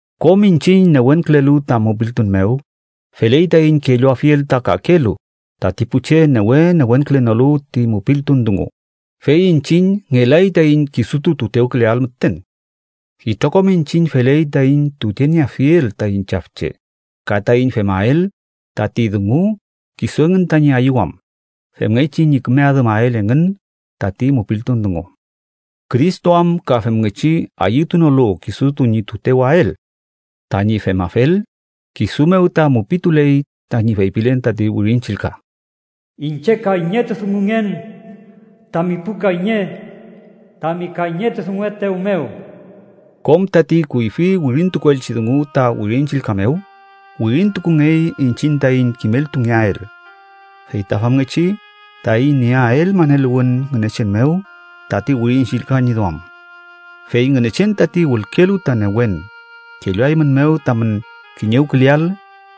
Kom iñchiñ newenkülelu ta mupiltun mew, feley taiñ kelluafiel ta kakelu tati pu che newe newenkülenolu ti mupiltun dungu, fey iñchiñ ngelay taiñ kisutu tutewküleael müten. Itrokom iñchiñ feley taiñ tutenieafiel taiñ chafche ka taiñ femael tati dungu kisu engün tañi ayüwam femngechi ñi küme adümael engün tati mupiltun dungu. Cristo am ka femngechi ayütunolu kisutu ñi tutewael. Tañi femafel, kisu mew ta mupituley tañi feypilen tati Wirin Chillka: “Iñche kayñetudungungen, tami pu kayñe tami kayñetudunguetew mew.” Kom tati kuyfi wirintukuelchi dungu ta Wirin Chillka mew, wirintukungey iñchiñ taiñ kimeltungeael. Fey ta famngechi taiñ nieael maneluwün Ngünechen mew tati Wirin Chillka ñi duam. Fey Ngünechen, tati wülkelu ta newen, kelluaeymünmew tamün kiñewküleael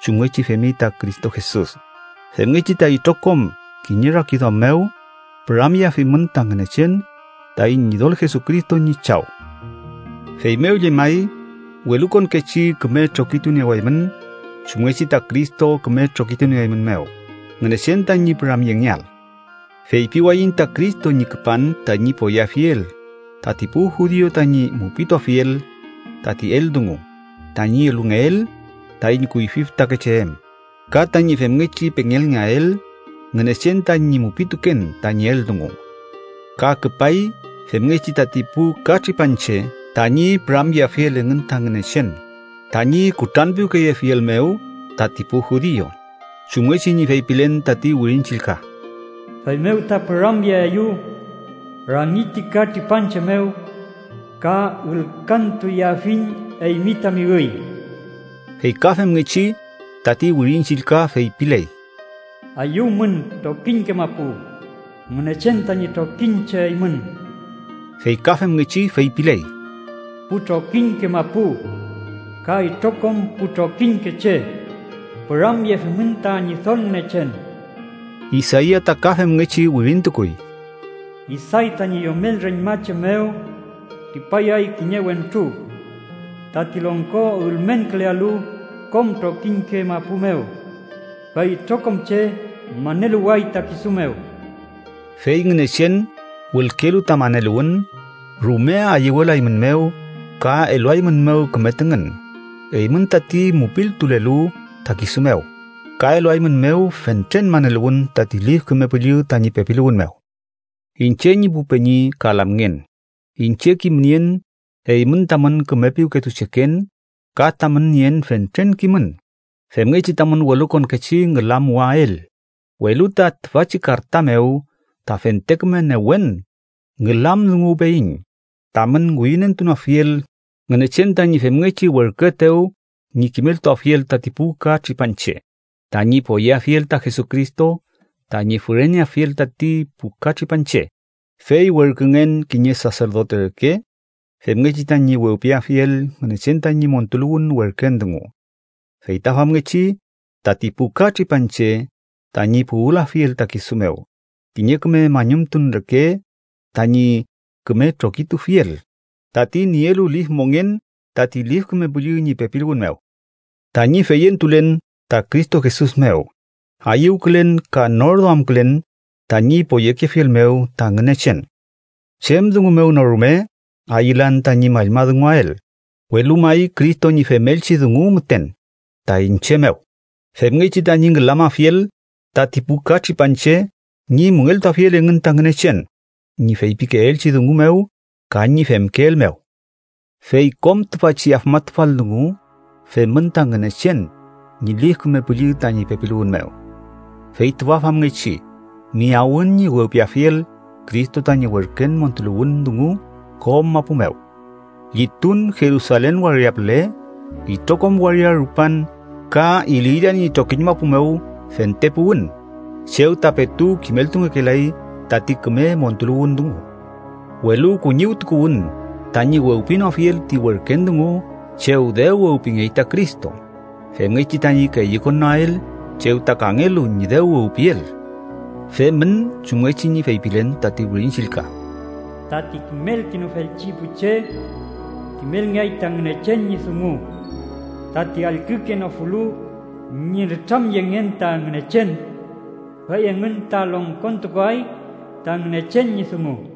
chumngechi femi ta Cristo Jesus, femngechi ta itrokom kiñe rakiduam mew, püramyeafimün ta Ngünechen, taiñ Ñidol Jesucristo ñi Chaw. Feymew llemay, welukonkechi küme trokituniewaymün, chumngechi ta Cristo küme trokitunieeymünmew, Ngünechen tañi püramyengeael. Feypiwayiñ ta Cristo ñi küpan tañi poyeafiel tati pu judiu tañi mupituafiel tati eldungu tañi elungeel taiñ kuyfi fütakeche em ka tañi femngechi pengelngeael Ngünechen tañi mupituken tañi eldungu. Ka küpay femngechi tati pu katripanche tañi püramyeafiel engün ta Ngünechen tañi kutranpiwkeyefiel mew tati pu judiu, chumngechi ñi feypilen tati Wirin Chillka: “Feymew ta püramyeaeyew rangi ti ka tripanche mew ka ülkantuyeafiñ eymi tami üy.” Fey ka femngechi, tati Wirin Chillka feypiley: “¡Ayüwmün, trokiñke mapu, Ngünechen tañi trokiñche eymün!” Fey ka femngechi feypiley: “Pu trokiñke mapu ka itrokom pu trokiñke che, ¡püramyefimün ta Ñidol Ngünechen!” Isaia ta ka femngechi wirintukuy: “Isay tañi yomel reñmache mew tripayay kiñe wentru tati longko ülmenkülealu kom trokiñke mapu mew, fey itrokom che maneluway ta kisu mew.” Fey Ngünechen, wülkelu ta maneluwün, rume ayüwelaeymünmew ka eluaeymünmew küme tüngün, eymün tati mupiltulelu ta kisu mew, ka eluaeymünmew fentren maneluwün tati Lif Küme Püllü tañi pepiluwün mew. Iñche ñi pu peñi ka lamngen, iñche kimnien eymün tamün küme piwketucheken ka tamün nien fentren kimün femngechi tamün welukonkechi ngülamuwael, welu ta tüfachi karta mew ta fente küme newen ngülamdunguwpeyiñ, tamün ngüyünentunoafiel Ngünechen tañi femngechi werküetew ñi kimeltuafiel tati pu ka tripanche tañi poyeafiel ta Jesucristo tañi füreneafiel tati pu ka tripanche. Fey werküngen kiñe saserdote reke, femngechi tañi wewpiafiel Ngünechen tañi montuluwün werken dungu. Fey ta famngechi tati pu ka tripanche tañi puwülafiel ta kisu mew, kiñe küme mañumtun reke tañi küme trokitufiel, tati nielu lif mongen tati Lif Küme Püllü ñi pepiluwün mew. Tañi feyentulen ta Cristo Jesus mew, ayüwkülen ka nor duamkülen tañi poyekefiel mew ta Ngünechen. Chem dungu mew no rume ayülan tañi mallmadunguael, welu may Cristo ñi femelchi dungu müten ta iñche mew, femngechi tañi ngülamafiel tati pu ka tripanche ñi müngeltuafiel engün ta Ngünechen ñi feypikeelchi dungu mew ka ñi femkeel mew. Fey kom tüfachi afmatufal dungu femün ta Ngünechen ñi Lif Küme Püllü tañi pepiluwün mew. Fey tüfa famngechi, miyawün ñi wewpiafiel Cristo tañi werken montuluwün dungu kom mapu mew. Llitun Jerusalen waria püle, itrokom waria rupan ka Iliria ñi trokiñ mapu mew fente puwün chew ta petu kimeltungekelay tati küme montuluwün dungu. Welu kuñiwtukuwün tañi wewpinoafiel ti werken dungu chew dew wewpingey ta Cristo, femngechi tañi keyükonnoael chew ta kangelu ñi dew wewpiel. Femün chumngechi ñi feypilen tati Wirin Chillka: “Tati kimelkenofelchi pu che, kimelngeay ta Ngünechen ñi dungu. Tati allkükenofulu ñi nütramyengen ta Ngünechen, fey engün ta longkontukuay ta Ngünechen ñi dungu.”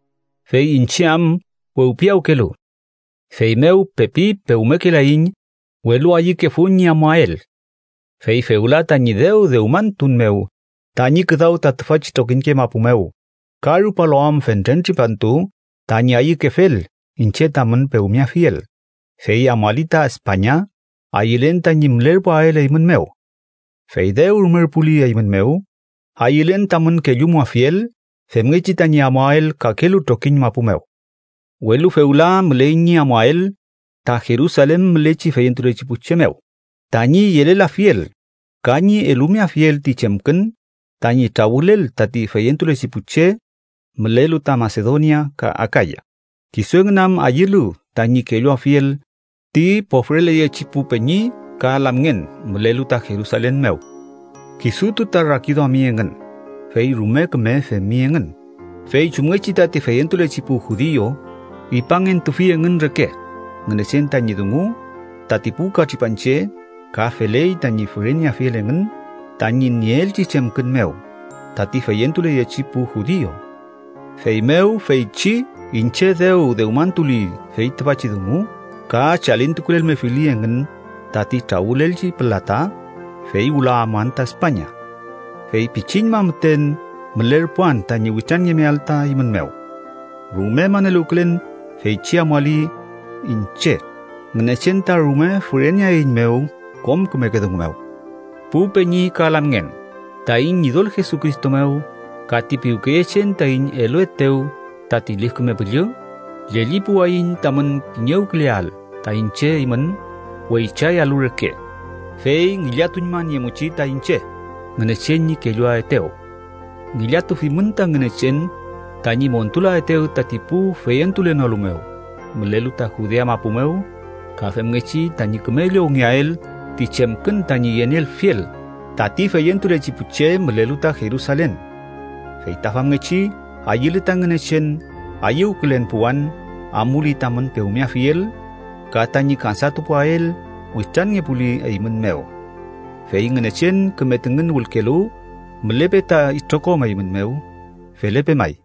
Fey iñche am wewpiyawkelu, feymew pepi pewmekelayiñ, welu ayükefun ñi amuael. Fey fewla tañi dew dewmantun mew tañi küdaw ta tüfachi trokiñke mapu mew, ka rupalu am fentren tripantu tañi ayükefel iñche tamün pewmeafiel, fey amuali ta España ayülen tañi mülerpuael eymün mew. Fey dew rumerpuli eymün mew, ayülen tamün kellumuafiel femngechi tañi amuael kakelu trokiñ mapu mew. Welu fewla müley ñi amuael ta Jerusalen mülechi feyentulechi pu che mew, tañi yelelafiel ka ñi elumeafiel ti chemkün tañi trawülel tati feyentulechi pu che mülelu ta Masedonia ka Akaya, kisu engün am ayülu tañi kelluafiel ti pofreleyechi pu peñi ka lamngen mülelu ta Jerusalen mew. Kisutu ta rakiduami engün, fey rume küme femi engün, fey chumngechi tati feyentulechi pu judiu ipangentufi engün reke Ngünechen tañi dungu tati pu ka tripanche, ka feley tañi füreneafiel engün tañi nieelchi chemkün mew tati feyentuleyechi pu judiu. Feymew, feychi iñche dew dewmantuli fey tüfachi dungu ka chalintukulelmefili engün tati trawülelchi pülata, fey wüla amuan ta España. Fey pichiñma müten mülerpuan tañi witranngemeael ta eymün mew. Rume maneluwkülen feychi amuali iñche, Ngünechen ta rume füreneaeiñmew kom kümeke dungu mew. Pu peñi ka lamngen, taiñ Ñidol Jesucristo mew ka ti piwkeyechen taiñ eluetew tati Lif Küme Püllü, llellipuwayiñ tamün kiñewküleael ta iñche eymün weychayalu reke, fey ngillatuñmaniemuchi ta iñche Ngünechen ñi kelluaetew. Ngillatufimün ta Ngünechen tañi montulaetew tati pu feyentulenolu mew mülelu ta Judea mapu mew, ka femngechi tañi küme llowngeael ti chemkün tañi yenielfiel tati feyentulechi pu che mülelu ta Jerusalen. Fey ta famngechi ayüle ta Ngünechen, ayüwkülen puwan, amuli tamün pewmeafiel ka tañi kansatupuwael witranngepuli eymün mew. Fey Ngünechen küme tüngün wülkelu, mülepe ta itrokom eymün mew. Felepe may.